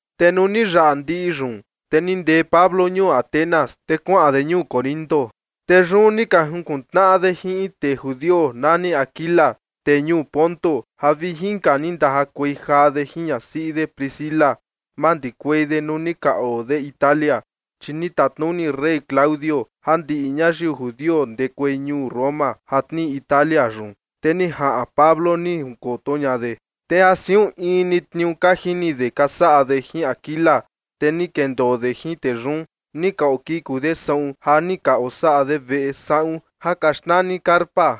Te nuu ni yaꞌa ndiꞌi yun, te ni ndee Pablo ñuu Atenas, te kuaꞌan de ñuu Corinto. Te yun ni ka junkuntnaꞌa de jin in tee judio nani Aquila, tee ñuu Ponto, ja vi inka ni ndajakuei jaa de jin ñasiꞌi de Priscila, mandikuei de nuu ni ka oo de Italia. Chi ni tatnuni rey Claudio ja ndiꞌi ñayiu judio ndekuei ñuu Roma ja tnii Italia yun. Te ni jaꞌan Pablo, ni jinkoto ña de. Te ja siun in ni tniuu ka jini de ka saꞌa de jin Aquila, te ni kendoo de jin tee yun, ni ka okiku de saꞌun ja ni ka osaꞌa de veꞌe saꞌun ja ka xnani carpa.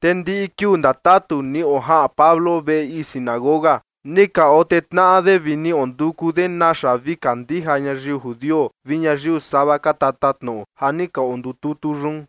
Te ndiꞌi kiuu ndatatu ni ojaꞌan Pablo veꞌe ii sinagoga, ni ka otee tnaꞌa de vi ni onduku de naxa vi kandija ñayiu judio vi ñayiu sava ka tatatnoꞌo ja ni ka ondututu yun.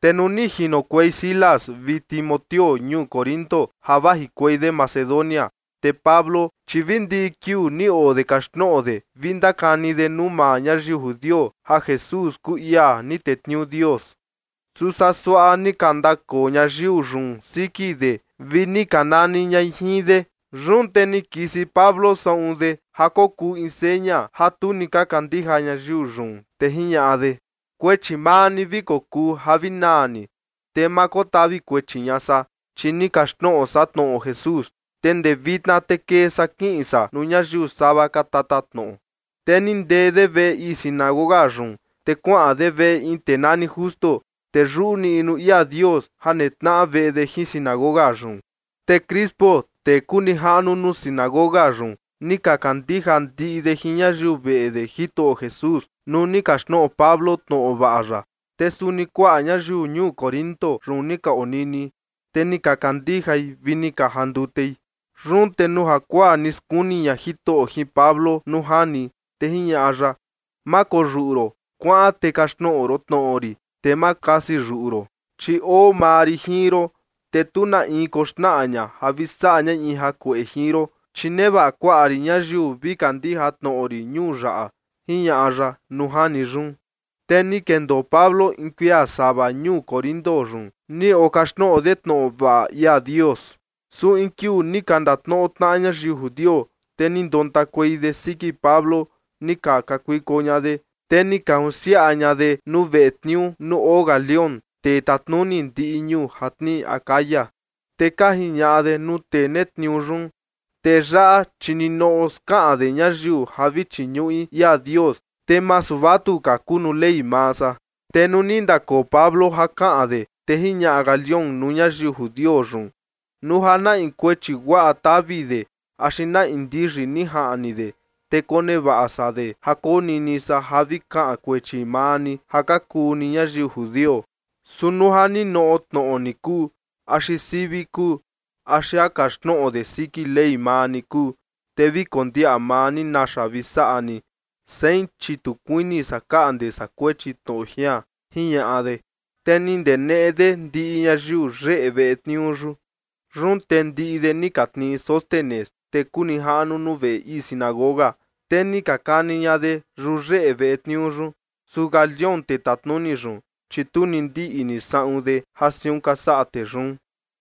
Te nuu ni jinokuei Silas vi Timoteo ñuu Corinto ja vajikuei de Macedonia, te Pablo, chi vi ndiꞌi kiuu ni oo de kaxtnoꞌo de vi ndakani de nuu maa ñayiu judio ja Jesús kuu ia ni tetniuu Dios. Su saa suaꞌa ni ka ndakoo ñayiu yun siki de vi ni ka nani ñai jin de. Yun te ni kisi Pablo saꞌun de ja kokuu in seña ja tu ni ka kandija ñayiu yun, te jiñaꞌa de: ―Kuechi maa ni vi kokuu ja vi naa ni. Te ma kotavi kuechi ña san, chi ni kaxtnoꞌo san tnoꞌo Jesús. Te ndee vitna te kee san kiꞌin san nuu ñayiu sava ka tatatnoꞌo. Te ni ndee de veꞌe ii sinagoga yun, te kuaꞌan de veꞌe in tee nani Justo, tee yuꞌu niꞌnu ia Dios ja netnaꞌa veꞌe de jin sinagoga yun. Te Crispo, tee kuu nijaꞌnu nuu sinagoga yun, ni ka kandija ndiꞌi de jin ñayiu veꞌe de Jitoꞌo Jesús, nuu ni kaxtnoꞌo Pablo tnoꞌo vaꞌa ya. Te suni kuaꞌa ñayiu ñuu Corinto yun ni ka onini, te ni ka kandijai vi ni ka jandutei. Yun te nuu jakuaa ni skuni ña Jitoꞌo jin Pablo nuu jani, te jiñaꞌa ya: ―Ma koyuꞌu ron, kuaꞌan te kaxtnoꞌo ron tnoꞌo rin, te ma kasi yuꞌu ron. Chi oo maa rin jin ron, te tu na in koxnaꞌa ña ja vi saꞌa ñai in jakueꞌe jin ron, chi nevaꞌa kuaꞌa rin ñayiu vi kandija tnoꞌo rin ñuu yaꞌa ―jiñaꞌa ya nuu jani yun. Te ni kendoo Pablo in kuia sava ñuu Corinto yun, ni okaxtnoꞌo de tnoꞌo vaꞌa ia Dios. Su in kiuu ni ka ndatnoꞌo tnaꞌa ñayiu judio, te ni ndontakuei de siki Pablo, ni ka kakuiko ña de, te ni ka junsiaꞌa ña de nuu veꞌe tniuu nuu oo Galión, tee tatnuni ndiꞌi ñuu ja tnii Acaya. Te ka jiñaꞌa de nuu tee netniuu yun: ―Tee yaꞌa, chi ninoꞌo skaꞌan de ñayiu ja vi chiñuꞌi ia Dios, te masu vatuka kuu nuu ley maa san. Te nuu ni ndakoo Pablo ja kaꞌan de, te jiñaꞌa Galión nuu ñayiu judio yun: ―Nuu ja na in kuechi guaꞌa tavi de axi na in ndiyi ni jaꞌni de, te konevaꞌa san de ja konini san ja vi kaꞌan kuechi maa ni ja ka kuu ni ñayiu judio. Su nuu ja ninoꞌo tnoꞌo ni kuu, axi sivi kuu, axi ja kaxtnoꞌo de siki Ley maa ni kuu, te vi kondiaꞌa maa ni naxa vi saꞌa ni. Sein, chi tu kuini san kaꞌnde san kuechi tnoꞌo jian ―jiñaꞌa de. Te ni ndeneꞌe de ndiꞌi ñayiu yeꞌe veꞌe tniuu yun. Yun te ndiꞌi de ni ka tnii Sóstenes, tee kuu nijaꞌnu nuu veꞌe ii sinagoga, te ni ka kani ña de yuyeꞌe veꞌe tniuu yun. Su Galión, tee tatnuni yun, chi tu ni ndiꞌni saꞌun de ja siun ka saꞌa tee yun.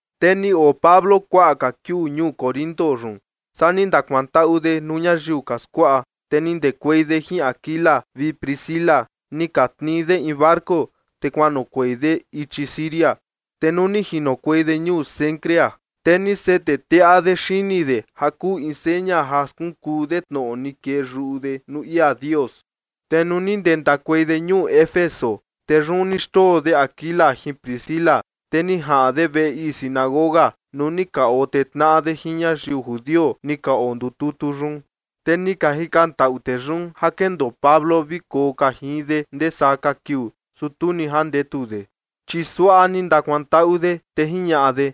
Te ni oo Pablo kuaꞌa ka kiuu ñuu Corinto yun. Saa ni ndakuantaꞌu de nuu ñayiu ka skuaꞌa, te ni ndekuei de jin Aquila vi Priscila, ni ka tnii de in barco, te kuanoꞌokuei de ichi Siria. Te nuu ni jinokuei de ñuu Cencrea, te ni sete teꞌa de xini de ja kuu in seña ja skunkuu de tnoꞌo ni kee yuꞌu de nuu ia Dios. Te nuu ni ndentakuei de ñuu Éfeso, te yun ni xndoo de Aquila jin Priscila. Te ni jaꞌan de veꞌe ii sinagoga nuu ni ka otee tnaꞌa de jin ñayiu judio ni ka ondututu yun. Te ni ka jikantaꞌu tee yun ja kendoo Pablo vi koo ka jin de ndee saa ka kiuu, su tu ni jandetu de. Chi suaꞌa ni ndakuantaꞌu de, te jiñaꞌa de: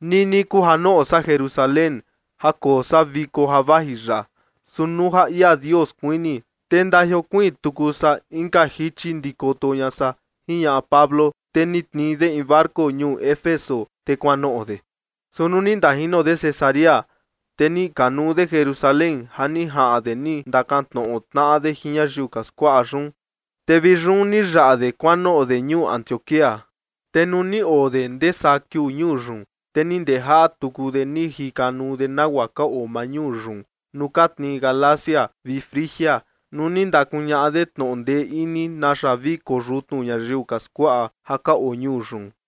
―Nini kuu ja noꞌo san Jerusalén ja koo san viko ja vaji yaꞌa, su nuu ja ia Dios kuini, te ndajiokuiin tuku san inka jichi ndikoto ña san ―jiñaꞌa Pablo. Te ni tnii de in barco ñuu Éfeso, te kuanoꞌo de. Su nuu ni ndajino de Cesarea, te ni kanuu de Jerusalén ja ni jaꞌan de ni ka ndakantnoꞌo tnaꞌa de jin ñayiu ka skuaꞌa yun, te vi yun ni yaꞌa de kuanoꞌo de ñuu Antioquía. Te nuu ni oo de ndee saa kiuu ñuu yun, te ni ndejaꞌa tuku de ni jikanuu de nagua ka oo maa ñuu yun nuu ka tnii Galacia vi Frigia, nuu ni ndakuñaꞌa de tnoꞌo ndee ini naxa vi koyutnu ñayiu ka skuaꞌa ja ka oo ñuu yun.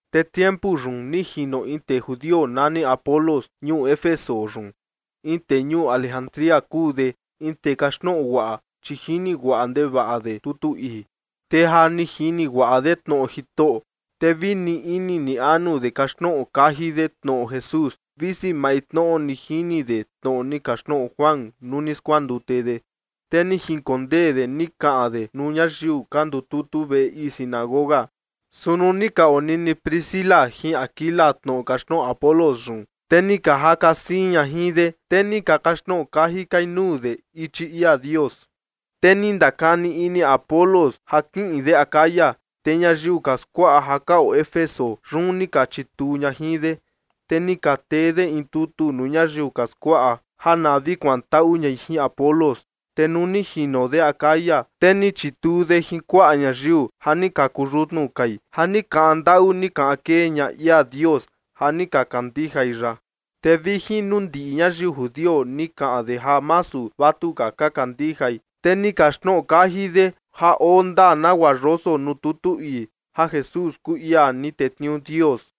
Te tiempu yun ni jino in tee judio nani Apolos ñuu Éfeso yun, in tee ñuu Alejandría kuu de, in tee kaxtnoꞌo guaꞌa, chi jini guaꞌa ndevaꞌa de tutu ii. Te ja ni jini guaꞌa de tnoꞌo Jitoꞌo, te vi ni ini ni anu de kaxtnoꞌo kaji de tnoꞌo Jesús, visi maintnoꞌo ni jini de tnoꞌo ni kaxtnoꞌo Juan nuu ni skuandute de. Te ni jinkondee de ni kaꞌan de nuu ñayiu ka ndututu veꞌe ii sinagoga, su nuu ni ka onini Priscila jin Aquila tnoꞌo kaxtnoꞌo Apolos yun, te ni ka jaka siin ña jin de, te ni ka kaxtnoꞌo kaji kai nuu de ichi ia Dios. Te ni ndakani ini Apolos ja kiꞌin de Acaya. Te ñayiu ka skuaꞌa ja ka oo Éfeso yun ni ka chituu ña jin de. Te ni ka tee de in tutu nuu ñayiu ka skuaꞌa ja na vi kuantaꞌu ñai jin Apolos. Te nuu ni jino de Acaya, te ni chituu de jin kuaꞌa ñayiu ja ni ka kuyutnu kai, ja ni kaꞌan ndaꞌu ni kaꞌan kee ña ia Dios ja ni ka kandijai ya. Te vi jin nuu ndiꞌi ñayiu judio ni kaꞌan de ja masu vatuka ka kandijai, te ni kaxtnoꞌo kaji de ja oo ndaa nagua yoso nuu tutu ii, ja Jesús kuu ia ni tetniuu Dios.